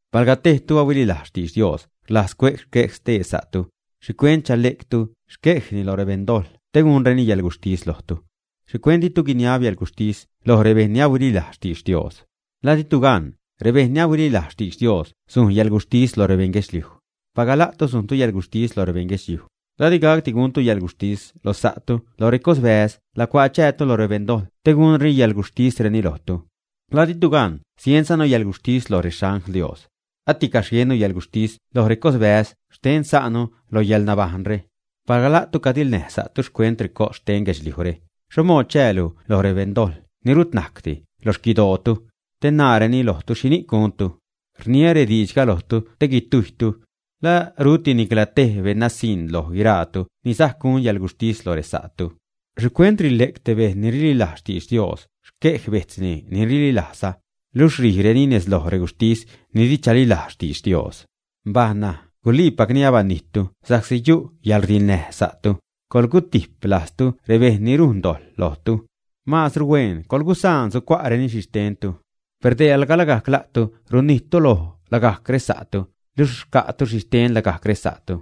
Palga tejtu ni ahuililajz xtidx Dios rlajz cue'c xquej stee sa'tu, ¿xhicuent chale'ctu xquejni loj rebeṉdojḻ te gunreni yäḻguxhtis lojtu? ¿Xhicuent ditu guiniab yäḻguxhtis loj rebejṉ ni ahuililajz xtidx Dios, ä? ¿La ditu gan, rebejṉ ni ahuililajz xtidx Dios sujn yäḻguxhtis lo rebeṉ guedxliuj, ä? Palga la'tu sujntu yäḻguxhtis lo rebeṉ guedxliuj, ¿la di gacdi guntu yäḻguxhtis lo sa'tu lo recosbäz lacuaa chäätu loj rebeṉdojḻ te gunreni xcäḻguxhtisreni lojtu, ä? ¿La ditu gan sienzanu yäḻguxhtis lo rexangl Dios, ä? ¡Aticaxh jiennu yäḻguxhtis loj recos bäze' xten sa'nu lo yäḻnabajṉre! Palga la'tu cadiḻnäj sa'tu xcuent recos xten guedxliujre, ¿xho mood chäälu loj rebeṉdojḻ ni rut najcdi loj xquidootu, te naareni lojtu xhini'c guntu, ä? Rniä rediidxga lojtu te guitujytu. ¿La ruti nicla tej beṉnasiṉ loj guiraatu ni sajc gun yäḻguxhtis lo resa'tu, ä? ¿Xhicuent rile'c te bejṉ ni rililajz xtidx Dios xquej bejtzni ni rililajzza, luxh rijreni nez loj reguxhtis ni di chalilajz xtidx Dios? Mbaj ṉaj, guliipacni alabanijttu sa'csi yu' yäḻrdiḻnäj sa'tu; coḻgutijp lajztu rebejṉ ni rujn dojḻ lojtu. Maazru huen coḻgusaan sucua'reni xhixtentu. Per dee, alga lagajc la'tu runnijttu loj lagajc resa'tu, luxh rca'tu xhixten lagajc resa'tu.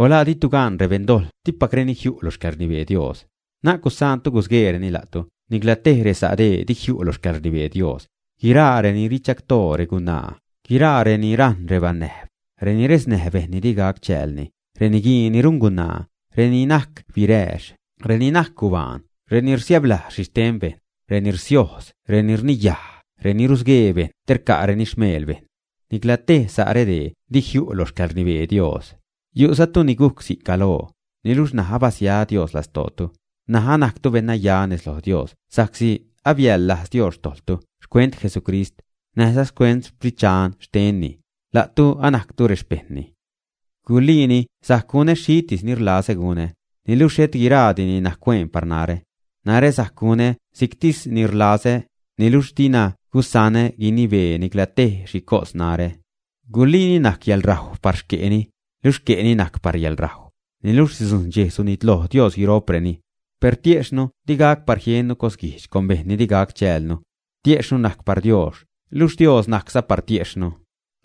O ¿la ditu gan rebeṉ dojḻ dipacreni jiu' lo xcäḻrnibee Dios, ä? Na'c gusaantu gusgueereni la'tu; nicla te resa' dee di jiu' lo xcäḻrnibee Dios: guiraa reni richagtoo regunaa; guiraa reni rajṉ rebanäjb; reni resnäj bejṉ ni di gac chäälni; reniguii ni rungunaa; reni najc birääx; reni najc gubaan; reni rsiäblajz xhixten bejṉ; reni rsiojz; reni rniyaj; reni rusguee bejṉ te rca'reni xmeel bejṉ. Nicla tej sa' redee di jiu' lo xcäḻrnibee Dios. Yu'zatu ni gujc si'c galoo, niluxh ṉaj abasia Dios lastootu, ṉaj anajctu beṉnaya nez loj Dios sa'csi abiäḻlajz Dios xtojḻtu xcuent Jesucrist, näjza xcuent Sprit Dxan xtenni. La'tu anajctu rexpejṉni. Guliini sajc gunä xhitis ni rlazä gunä, niluxh xhet guiraadini najc hueen par narä. Narä sajc gunä si'ctis ni rlazä, niluxh dina gusanä guinibee nicla tej xhi cos narä. Guliini najc yäḻrajw par xque'ni, luxh xque'ni najc par yäḻrajw, niluxh sidzujṉ dxej sunitloj Dios guiro'preni. Per tiejxhnu di gac par jiennu cosguijdx con bejṉ ni di gac chäälnu. Tiejxhnu najc par Dios, luxh Dios najcza par tiejxhnu.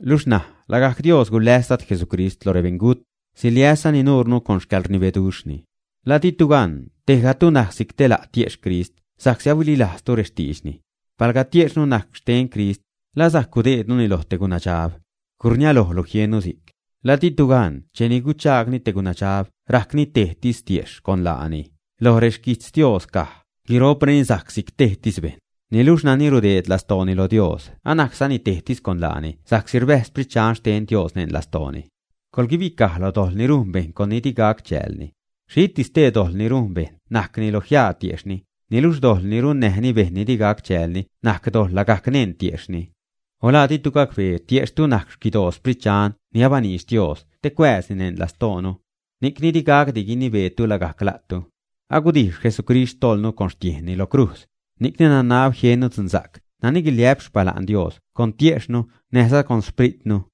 Luxh ṉaj lagajc Dios guläs Dad Jesucrist lo rebeṉgut, siliäszani nuurnu con xcäḻrnibeduxhni. ¿La ditu gan tejgatu najc si'c te la' tiejxh Crist sa'csi ahuililajztu rextiidxni, ä? Palga tiejxhnu najc xten Crist, ¿la sajc gudeednuni loj te gunadxab, ä? ¡Gurniälojlu jiennu si'c! ¿La ditu gan cheni guchaagni te gunadxab rajcni tejtis tiejxh con laani, ä? Loj rexquijtz Dios caj: “Guiro'preni sajc si'c tejtis bejṉ.” Niluxh nani rudeed lastooni lo Dios anajczani tejtis con laani sa'csi rbäjz Sprit Dxan xten Dios neṉ lastooni. Coḻguibicaj lo dojḻ ni rujn bejṉ con nani di gac chäälni. Xhitis stee dojḻ ni rujn bejṉ najcni lo jiaa tiejxhni, niluxh dojḻ ni runnäjni bejṉ ni di gac chäälni najc dojḻ lagajc neṉ tiejxhni. O ¿la ditu gacbee tiejxhtu najc xquidoo Sprit Dxan ni abaniidx Dios te cuääzni neṉ lastoonu, ä? Ni'cni di gacdi guinibeetu lagajc la'tu. Agudijx Jesucrist xtojḻnu con xtiejnni lo crujz, ni'cni nanab jiennu dzunsa'c nani guiliä'p xpala'n Dios con tiejxhnu näjza Xpritnu.